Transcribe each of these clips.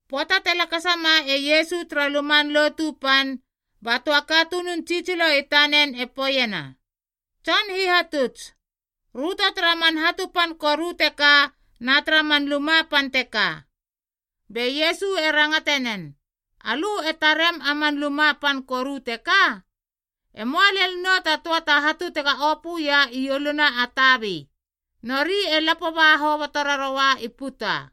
Pöata te lakasa ma e Iesu tara Luman Lotu Pan, ba töa katunun tsitsilo i tanen e poeiena, “Tson Hihatuts, röto tara man hatu pan koru teka na tara man luma pan teka.” Be Iesu e rangate nen, “Alö e tarem a man luma pan koru teka? E möa lel nou ta töa ta hatu tega opö ia ieluna a tabi, nori e lapo ba hoboto raroua i puta.”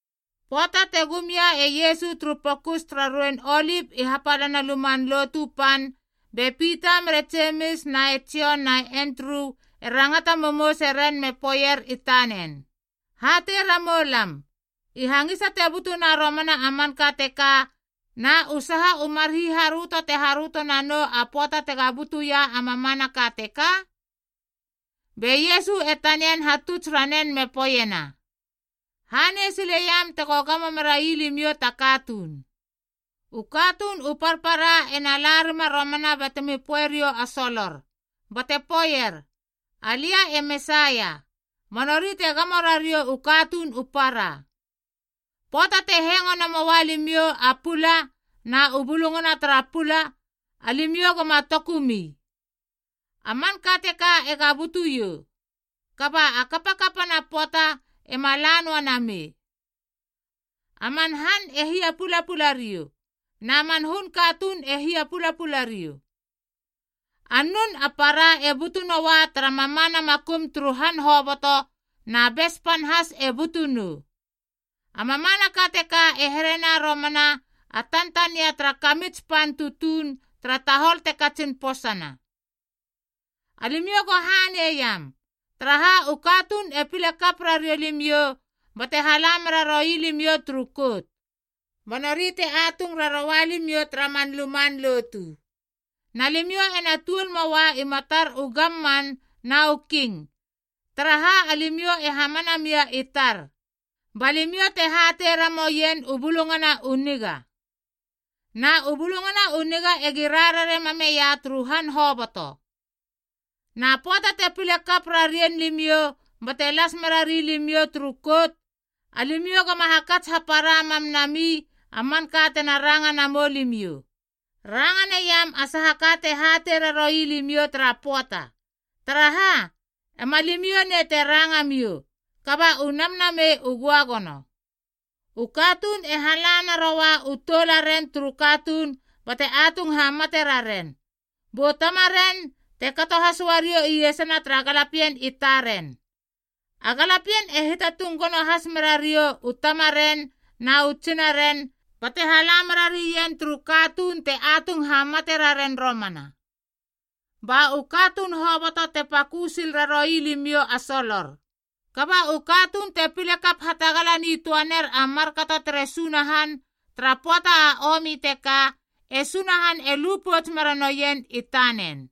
Pöata te gum ia e Iesu turu Pokus tara Ruein Olip i hapalana Luman Lotu Pan, be Pita mere Jemis na e Jon na e Endru e rangata momouse ren me poeier i tanen. “Hatei ramou lam, i hangisa te butuna romana a manka teka, na u saha u mar hiharöto te haröto nanou a pöata tega butu ia a mamanaka teka?” Be Iesu e tanian hatuts ranen me poeiena, “Hanei sileiam tego gamo mera ii limiou ta katuun. U katuun u parpara ena la rima romana batemi poe riou a solor, bate poeier, ‘Alia e Mesaia,’ ba nori te gamo rariou u katuun u para. Pöata te hengo namoa limiou a pula na u bulungana tara pula alimiou goma tokumi. A manka teka ega butu iou, kaba a kapkapana pöata ema la noa namei. A man han e hia pulapula riou, na man hun katuun e hia pulapula riou. A nun a para e butu noua tara mamana makum turu han hoboto na bes pan has e butu nou. A mamanaka teka e herena romana a tantania tara kamits pan tutuun tara tahol te katsin posana. “Alimiou go hanei iam, taraha u katuun e pile kap rariou limiou bate hala mera roi limiou turu kout, ba nori te atung raroua limiou tara man luman lotu.a Na limiou ena tuol möa i matar u gamman na u king, taraha alimiou e hamana mia i tar, ba limiou te hatei ramouien u Bulungana u Niga. Na u Bulungana u Niga egi rarare mameia turu han hoboto. “Na pöata te pile kap rarien limiou bate las mera rilimiou turu kout, alimiou goma hakats hapara mam nami a manka tena ranga namou limiou. Ranga naiam a saha ka te hatei raroui limiou tara pöata, taraha, ema limiou nei te ranga miou, kaba u Namnamei u Göagono. U katuun e hala naroua u toularen turu katuun bate atung hamate raren, bu tamaren te kato has uariou iesana tara galapien i taren. A galapien e hiatatung gono has merariou u tamaren na u tsinaren bate hala mera rien turu katuun te atung hamate raren romana. Ba u katuun hoboto te pakö sil raroui limiou a solor. Kaba u katuun te pile kap hatagala nitöa ner a markato tere Sunahan tara pöata a omi teka, e Sunahan e lu pouts mera noien i tanen.”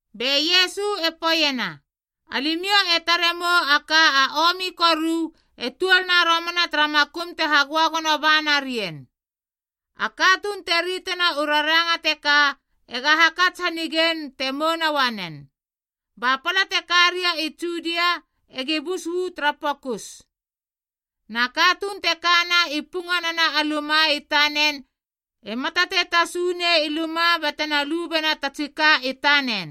Be Iesu e poeiena, “Alimiou e tare mou a ka a omi koru e tuolna romana tara makum te hagöagono ba narien.” (A katuun te ritena u raranga teka ega hakats hanigein te mouna uanen.) “Ba pala te ka ria i Judia egi bus uu tara pokus. Na katuun te kana i punganana a luma i tanen ema tatei tasu nei i luma batena lu bena ta tsi ka i tanen.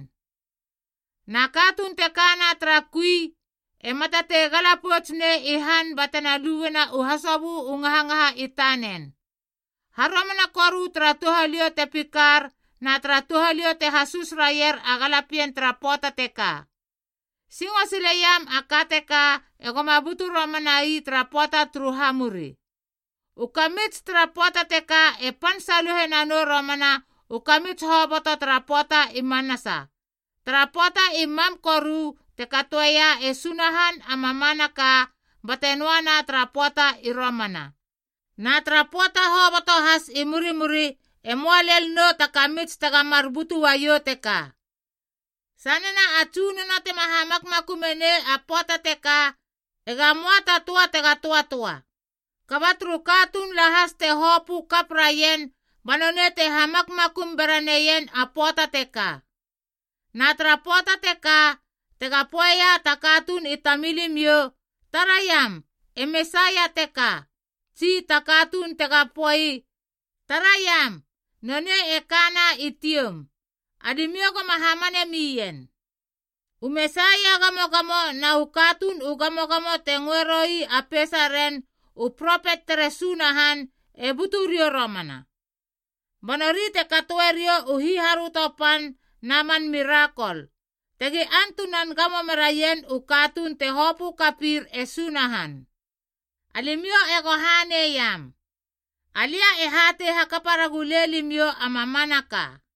Na katuun te kana tara kui ema tatei gala pouts nei i han batena luena u hasobö u ngahangaha i tanen. Haromana koru tara touhaliou te pikar na tara touhaliou te hasus raier a galapien tara pöata teka. Singo sileiam a ka teka egoma butu romana ii tara pöata turu hamuri. U kamits tara pöata teka e pan saluhe nanou romana u kamits hoboto tara pöata i manasa, tara pöata i mam koru te katoeia e Sunahan a mamanaka bate noana tara pöata i romana. Na tara pöata hoboto has i murimuri e möa lel nou ta kamits tega mar butu uaiou teka. Sanena a Tsunono tema hamakmakumei a pöata teka, ega möa ta töa tega töatöa. Kaba turu katuun lahas te hopö kap raien ba nonei te hamakmakum bera neien a pöata teka. “Na tara pöata teka, tega poeia ta katuun i tamilimiou, ‘Taraiam, e Mesaia teka!’ tsi ta katuun tega poei, ‘Taraiam, nonei e kana i tioum!’ Alimiou goma hamane mien. U Mesaia gamogamo na u katuun u gamogamo te ngöeroi a peisaren u propet tere Sunahan e butu riou romana. Ba nori te katoeriou u hiharöto pan na man mirakol, tegi antunan gamo meraien u katuun te hopö kapir e Sunahan. Alimiou ego haneiam. Alia e hatei hakapa ragulei limiou a mamanaka.”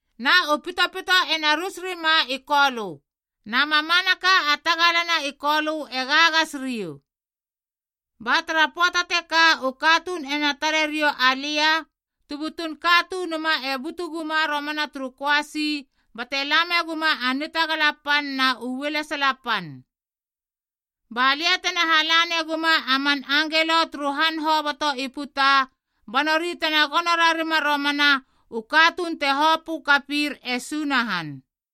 na u pitopito ena rus rima i kolö, na mamanaka a tagala na i kolö e gagas riou.’ “Ba tara pöata teka u katuun ena tare riou alia, tu butun Katunuma e butu guma romana turu köasi bate lame guma a nitagala pan na u ualesala pan. Balia tena hala neguma a man angelo turu han hoboto i puta ba nori tena gono rarima romana u katuun te hopö kapir e Sunahan.”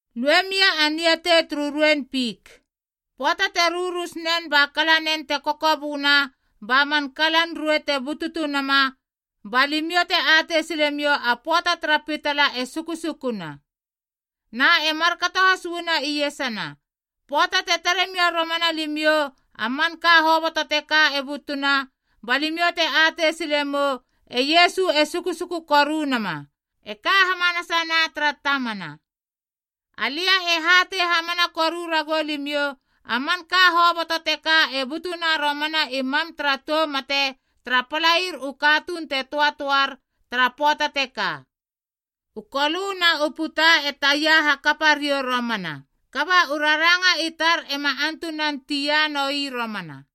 “Lue mia a niatei turu ruein fik. Pöata te rurus nen ba kala nen te kokoböna ba man kalan ruei te bututu nama, balimiou te atei silemiou a pöata tara pitala e sukusukuna. Na e markato has uana iesana, pöata te tare mia romana limiou a manka hoboto teka e butuna, ba limiou te atei sile mou a pöata e sukusuku koru nama, e ka hamanasa na tara tamana. Alia e hatei hamana koru ragou limiou, a manka hoboto teka e butuna romana i mam tara tou mate tara palair u katuun te töatöar tara pöata teka. U kolö na u puta e taia hakapariou romana, kaba u raranga i tar ema antunan tia noi romana.”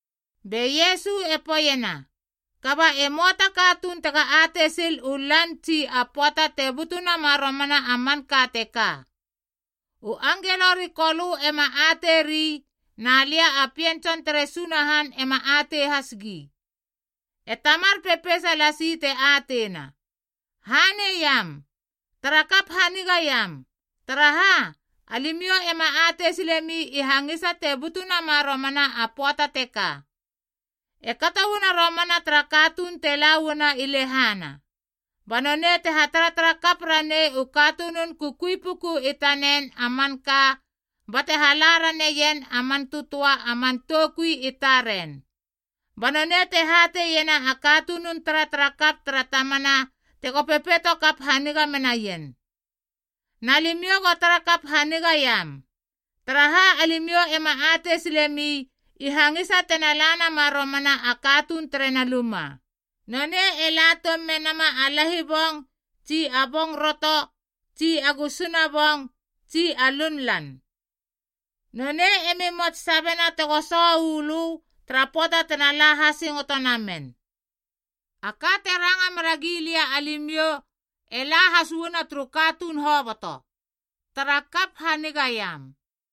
Be Iesu e poeiena, “Kaba e möa ta katuun tega atei sil u lan tsi a pöata te butu nama romana a manka teka. U angelo ri Kolö ema ateiri na liab a Pien Tson tere Sunahan ema atei has gi. E Tamar pepeisa lasi te ateina. Haneiam, tara kap hanigaiam. Taraha, alimiou ema atei silemi i hangisa te butu nama romana a pöata teka. “E kato uana romana tara katuun te la uana i lehana, ba nonei te hataratara kap ranei u katunun kukui puku i tanen a manka, bate hala raneien a man tötöa a man toukui i taren. Ba nonei te hateiena a katunun taratarakap tara tamana tego pepeitokap haniga menaien. Na limiou go tara kap hanigaiam, taraha alimiou ema atei silemi i hangisa tena la nama romana a katuun terena luma. Nonei e la toum menama a lahibong tsi a bong roto tsi a gusuna bong tsi a lunlan. Nonei emi mots sabena tego soho uu lö tara pöata tena la hasingoto namen. A ka te ranga mera gilia alimiou e la has uana turu katuun hoboto: tara kap hanigaiam.”